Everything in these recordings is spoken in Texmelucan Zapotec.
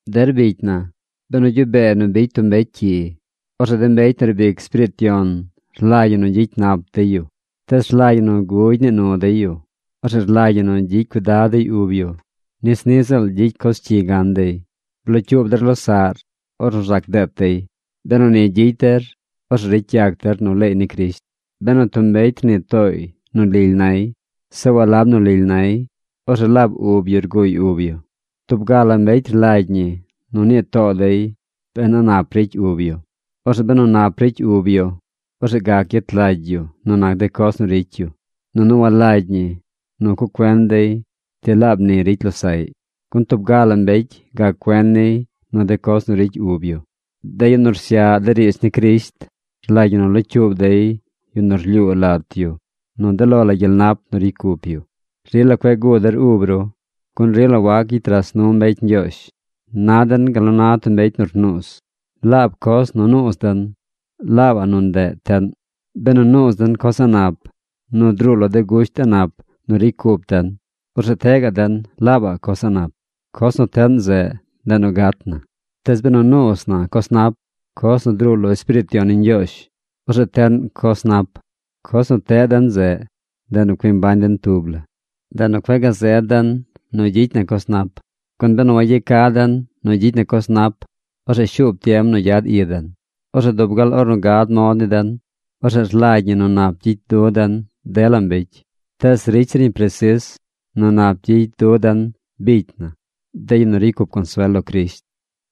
Der bicy na, benu gyuꞌ bee nu bicy tub mbecy cyi, orzeꞌ de mbecy nu riib ic Espiriit Yon rlagy ñi nu gyicy nap dey yu. Tees rlagy ñi nu gugy nii nu dey yu. Orzeꞌ rlagy ñi nu gyicy cuidad dey ub yu nis niꞌ ziꞌl gyicy coz cyi gan dey. Blocyuub der losaꞌr ornu rzac deet dey. Benu ni gyicy der, orzeꞌ ricy yac der nu leey ni Crisht. Benu tub mbecy rnii tooy nu lily nay, zeꞌ walab nu lily nay, orzeꞌ laab ub yu rguuy ub yu. Tub ga la mbecy rlagy ñi nu nii too dey ben a nap ricy ub yu. Orzeꞌ benu nap ricy ub yu, orzeꞌ gac gyet lagy yu nu nac de coz nu ricy yu. Nunu walagy ñi nu cuꞌ cuen dey ti laab ni ricy losaꞌy. Gun tub ga la mbecy gac cuen niy nu de coz nu ricy ub yu. De yu nu rsyaꞌ de riidz ni Crisht rlagy ñi nu locyuub dey yu nu rlyuu lat yu nu de lo la gyel nap nu ricy cup yu. Rila cueꞌ guu der ub ru, gun rila wac gyicy ras nu mbecy Ñgyoozh. Na den gal nu na tub mbecy nu rnuuz. Laab coz nu nuuz den, laabaꞌ nu ndeꞌ teꞌn. Benu nuuz den coz a̱ꞌ nap nu druu lo de gusht a̱ꞌ nap nu ricy cup den, orzeꞌ teꞌ gaꞌ den laabaꞌ coz a̱ꞌ nap. Coz nu teꞌn zeꞌ, ndeꞌ nu gat na. Tees benu nuuz na coz nap, coz nu druu lo Espiriit Yon ni Ñgyoozh, orzeꞌ teꞌn coz nap. Coz nu teꞌ den zeꞌ, ndeꞌ nu cui mbañ den tub la. Ndeꞌ nu cueꞌ gazed den nu gyicy na coz nap. Gun benu wayeca den nu gyicy na coz nap, orzeꞌ shuub tiem nu gyad i den. Orzeꞌ dub gal ornu gad mod ni den, orzeꞌ rlagy ñi nu nap gyicy du den dela mbecy. Tees ricy zir ñi presis nu nap gyicy dun de bicy na, de yu nu ricy cup consuel lo Crisht.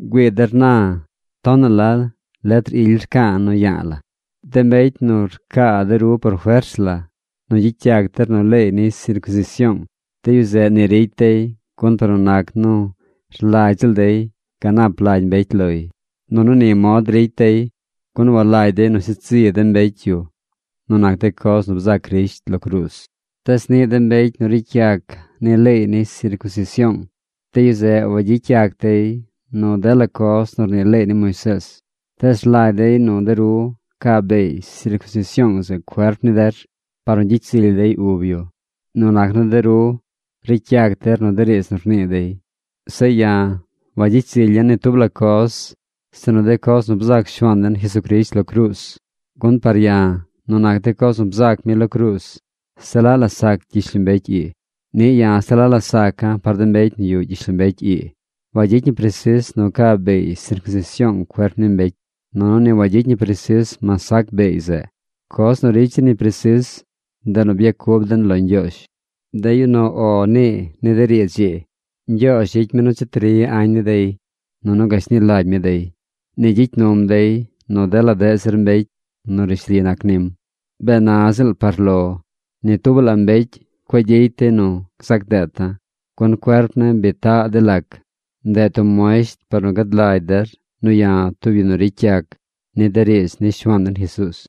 ¡Güii der na tonaꞌ la letr ily rca̱a̱ nu ya̱a̱ la̱! De mbecy nu rcaa de ru por fers la nu gyicy yac der nu leey ni sircunsision, de yu zeꞌ ni ricy dey gun par nu nac nu rlagy ziꞌl dey ganap lagy mbecy loy. Nunu ni mod ricy dey gun walagy dey nu sheed zi de mbecy yu nu nac de coz nu bzac Crisht lo cruuz. Tees niꞌ de mbecy nu ricy yac nu leey ni sircunsision, de yu zeꞌ wagyicy yac dey nu dela coz nu rnii leey ni Moisees. Tees rlagy dey nu de ru ca beey sircunsision zeꞌ cuerp ni der par nu gyicy zily dey ub yu nu nac nu de ru nu ricy yac der de riidz nu rnii dey. Zeꞌ ya̱, wagyicy zilya̱ ni tub la coz sinu de coz nu bzac Shuaan den Jesucrisht lo cruuz, gun par ya̱ nu nac de coz nu bzac mi lo cruuz, se laꞌ la sac gyishlombecy ii. Niꞌ ya̱ se la saca̱ par de mbecy nu yuꞌ gyishlombecy ii. Wagyicy ñi presis nu ca beey sircunsision cuerp ni mbecy, nunu ni wagyicy ñi presis mas sac beey zeꞌ. Coz nu ricy zir ñi presis, ndeꞌ nu byacub den lo Ñgyoozh. De yu nu “O” nii ni de riidz ii, Ñgyoozh gyicy mi nu cheti ri añ ni dey, nunu gashni lagy mi dey. Ni gyicy num dey nu dela deꞌ zir mbecy nu rishli nac nim. Bee na ziꞌl par lo ni tubaꞌ la mbecy cueꞌ gyicy dey nu gzac deeta̱, gun cuerp ne̱ bi taꞌ de lac. Ndeꞌ tub muesht par nu gad lagy der nu ya̱ tub yu nu ricy yac ni de riidz ni Shuaan den Jesuuz.